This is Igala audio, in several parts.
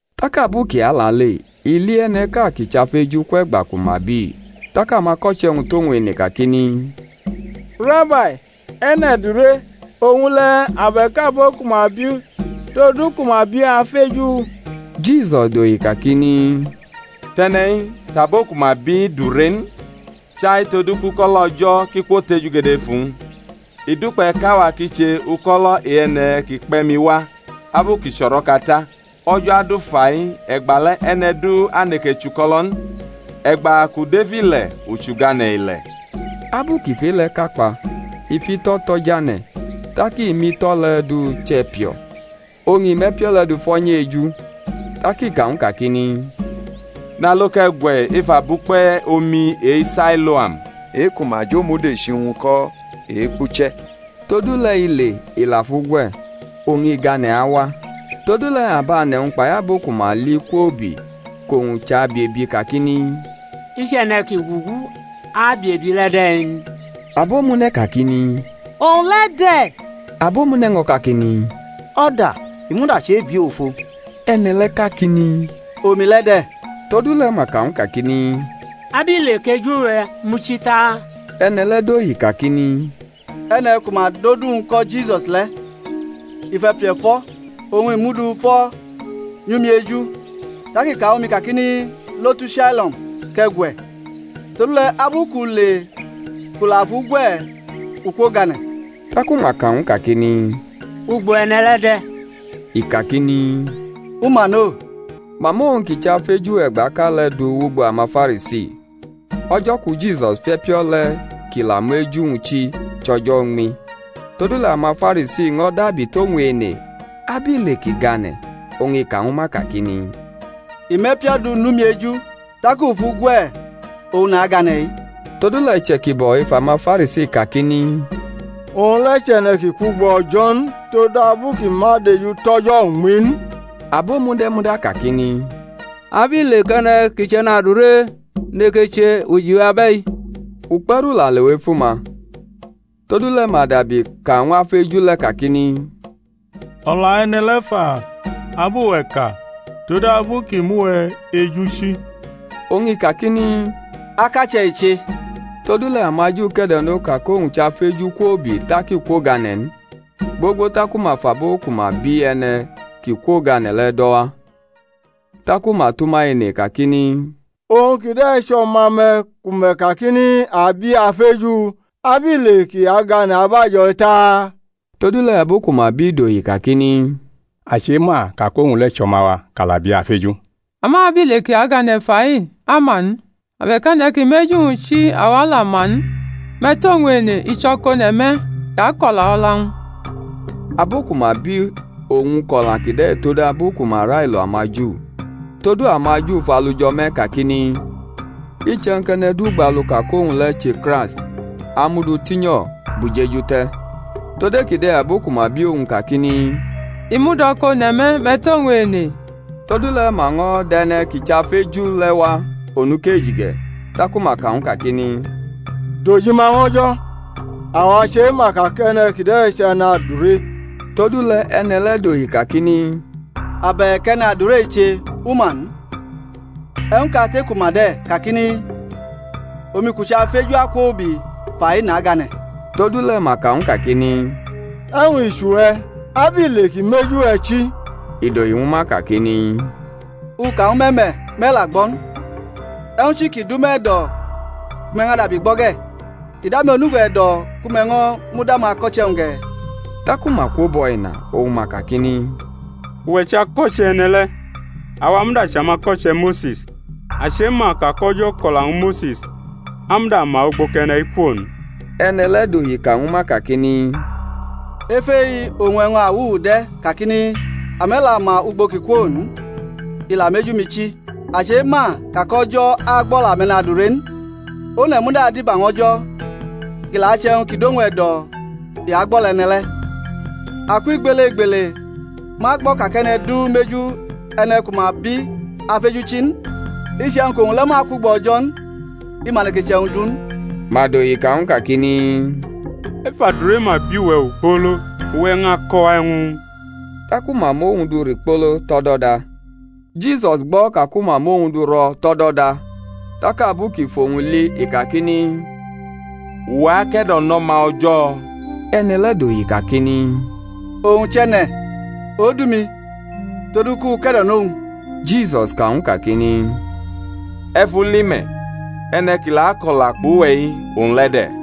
Tak abu kʼi alale i li e̩ne̩ʼka ki chʼafeju kwʼe̩gba ku ma biʼi. Tak amako̩che̩-wñ tʼowñ ene kakini, Rabai, e̩ne̩ dure, owñ le̩ abe̩k abo ku ma biʼu, todu ku ma ki biʼi afeju? Jisus dohi kakini, Tʼe̩ne̩-i, tʼabo ku ma biʼi dure n, chai todu kʼuko̩lo̩ O̩jo̩ ki kwotejugede ef uwñ. I dukpe̩ kʼawa ki che uko̩lo̩ e-e̩ne̩ ki kpe̩ mi wa abu ki chʼo̩ro̩ka ta; o̩jo̩ adu fai e̩gbale̩ e̩ne̩ du aneke chʼuko̩lo̩ n. E̩gba kʼu dʼef ile̩ u chʼugane̩ ile̩. Abu kʼi fʼe-le̩ ka kpa, i fʼito̩ to̩ jane̩, tak i mʼito̩ le̩ du chʼe̩pio̩, oñ i mʼe̩pio̩ le̩ du fo̩ nyʼu eju; tak i ka ñw u kakini, Nalo, kʼe̩ gwe̩ ef abukpe omi e-Sailoam (e-ku ma jo-mudechi-wñ ko̩ Ekpuche̩). Todule̩ i le, i la fʼu gwe̩, oñ i gane̩ awa. Todule̩ abʼane̩-wñ kpai abo ku ma li kwoubi kʼowñ chʼabiebi kakini, I chʼe̩ne̩ ki gugu abiebi le̩ de̩ n? Abomune̩ kakini, owñ le̩ de̩; abomune̩ ño̩ kakini, O̩da, i muda chʼebiʼu ofo. E̩ne̩ le̩ kakini, Omi le̩ de̩. Todule̩ ma ka ñw u kakini, Abile kʼeju-we̩ muchi ta? E̩ne̩ le̩ dohi kakini, E̩ne̩ ku ma dʼodu-wñ ko̩ Jisus le̩, i fʼe̩pio̩ fo̩, oñ i mʼu du fo̩ nyʼumi eju, tak i ka ñwu mi kakini, Lo tu Sailoam kʼe̩ gwe̩; todule̩ abu kʼu le kʼu la fʼu gwe̩ u kwogane̩. Taku ma ka ñw u kakini, Ugbo e̩ne̩ le̩ de̩? I kakini, U ma no. Ma mʼowñ ki chʼafeju e̩gbaʼka le̩ du wʼugbo amaFarisi. O̩jo̩ ku Jisus fʼe̩pio̩ le̩ kʼi la mʼeju-wñ chi chʼo̩jo̩ uñmi. Todule̩ amaFarisi ño̩ dabi tʼowñ ene abile kʼi gane̩. Oñ i ka ñwu ma kakini, I mʼe̩pio̩ du nʼumi eju, tak u fʼu gwe̩, oñ nagane̩-i. Todule̩ iche̩kibo̩ ef amaFarisi kakini, Owñ le̩ chʼe̩ne̩ ki kwʼugbo O̩jo̩ n, todabu kʼi ma dejutʼo̩jo̩ uñmi n. Abomune̩ muda kakini, Abile kʼe̩ne̩ ki chʼe̩nadure neke che ujiwe abe̩-i? Ukpe̩ru la lewʼef uma. Todule̩ ma dabi ka ñw afeju le̩ kakini, O̩la e̩ne̩ le̩ fa, ab uwe̩ ka, todabu kʼi mʼuwe̩ eju chi? Oñ i kakini, Akache̩ i che. Todule̩ amaJu ke̩do̩no ka kʼowñ chʼafeju kwoubi tak i kwogane̩ n, gbogbo taku ma fʼabo ku ma bi e̩ne̩ ki kwogane̩ le̩ do̩ wa; taku ma tʼuma ene kakini, Owñ kide̩ chʼo̩ma-me̩ ku me̩ kakini, A bi afeju? Abile kʼi agane̩ abajo̩-i ta? Todule̩ abo ku ma biʼi dohi kakini, A chema ka kʼowñ le̩ chʼo̩ma-wa, kʼa la biʼi afeju; ama abile kʼi agane̩ fai, a ma n, abe̩k e̩ne̩ ki mʼeju-wñ chi awa la ma n; me̩ tʼowñ ene; i chʼo̩kone̩ me̩; i ako̩la o̩la-wñ. Abo ku ma bi owñ kʼo̩la kide̩ todabu ku ma railo amaJu; todu amaJu fʼalu jo̩ me̩ kakini, Iche̩wñ kʼe̩ne̩ du gbalu ka kʼowñ le̩ che Kraist, a mʼu du tinyo̩ bʼujeju te̩. Tod e-kide̩ abo ku ma bi owñ kakini, I mud o̩kone̩ me̩, me̩ tʼowñ ene. Todule̩ ma ño̩ dʼe̩ne̩ ki chʼafeju le̩ wa onukeji ge̩; taku ma ka ñw u kakini, Dʼojima ñw O̩jo̩; awa chema ka kʼe̩ne̩ kide̩ chʼe̩nadure. Todule̩ e̩ne̩ le̩ dohi kakini, Abe̩k e̩nadure i che, u ma n; e̩wñ kate kʼu ma de̩, kakini, Omi kʼu chʼafeju akwoubi fa-i nagane̩. Todule̩ ma ka ñw u kakini, E̩wñ i chʼuwe̩? Abile kʼi mʼeju-we̩ chi? I dohi ñwu ma kakini, U ka ñwu me̩ me̩, me̩ la gbo̩ n; e̩wñ chi ki dʼume̩ e̩do̩ ku me̩ ñʼadabi gbo̩ ge̩? Idʼame̩ onugo e̩do̩ ku me̩ ño̩ mud amako̩che̩-wñ ge̩? Taku ma kwobʼo̩ ina oñ ma kakini, Uwe̩ chʼako̩che̩ e̩ne̩ le̩. Awa muda chʼamako̩che̩ Mose̩s. A chema ka kʼO̩jo̩ ko̩la ñwu Mose̩s; a muda ma ugbo kʼe̩ne̩-i kwo n. E̩ne̩ le̩ dohi ka ñwu ma kakini, Ef e-i oñ e̩wñ awuwu de̩, kakini, Ame̩ la ma ugbo kʼi kwo n, i la mʼeju-mi chi! A chema ka kʼO̩jo̩ agbʼo̩la ame̩nadure n; one̩ muda adiba ñw O̩jo̩, kʼi la achʼe̩wñ ki dʼowñ e̩do̩, i agbʼo̩la e̩ne̩ le̩. Akwʼigbelegbele ma gbo̩ ka kʼe̩ne̩ du mʼeju e̩ne̩ ku ma bi afeju chi n. Iche̩wñ kʼowñ le̩ ma kwʼugbo O̩jo̩ n, i ma neke che e̩wñ du n. Ma dohi ka ñw u kakini, Ef adure ma bi we̩ ogbolo, uwe̩ ñʼako̩ wa e̩wñ? Taku ma mʼowñ du rikpolo tʼo̩do̩da. Jisus gbo̩ ka ku ma mʼowñ du ro̩ tʼo̩do̩da; tak abu kʼi fʼowñ li i kakini, Uwe̩ ake̩do̩nʼO̩ma O̩jo̩? E̩ne̩ le̩ dohi kakini, Owñ chʼe̩ne̩, Odu-mi, todu kʼu ke̩do̩nʼowñ? Jisus ka ñw u kakini, E̩ fʼu li me̩, e̩ne̩ ki la akʼo̩la kpʼuwe̩-i, owñ le̩ de̩.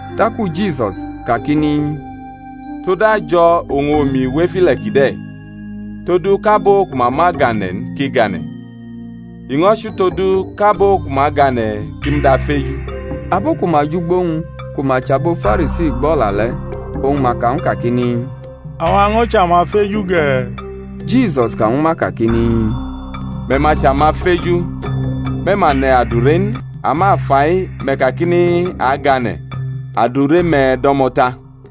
Taku Jisus kakini, Tod ajo̩ oñ omi wʼef ile̩ kide̩, todu kʼabo ku ma ma gane̩ n ki gane̩; i ño̩ chʼutodu kʼabo ku ma gane̩ ki mud afeju. Abo ku ma jʼugbo-wñ ku ma chʼabo Farisi, gb o̩la le̩, oñ ma ka ñw u kakini, Awa ño̩ chʼamafeju ge̩? Jisus ka ñwu ma kakini, Me̩ ma chʼamafeju, me̩ ma ne̩ adure n; ama fa-i me̩ kakini, A gane̩; adure-me̩ do̩mo̩ ta.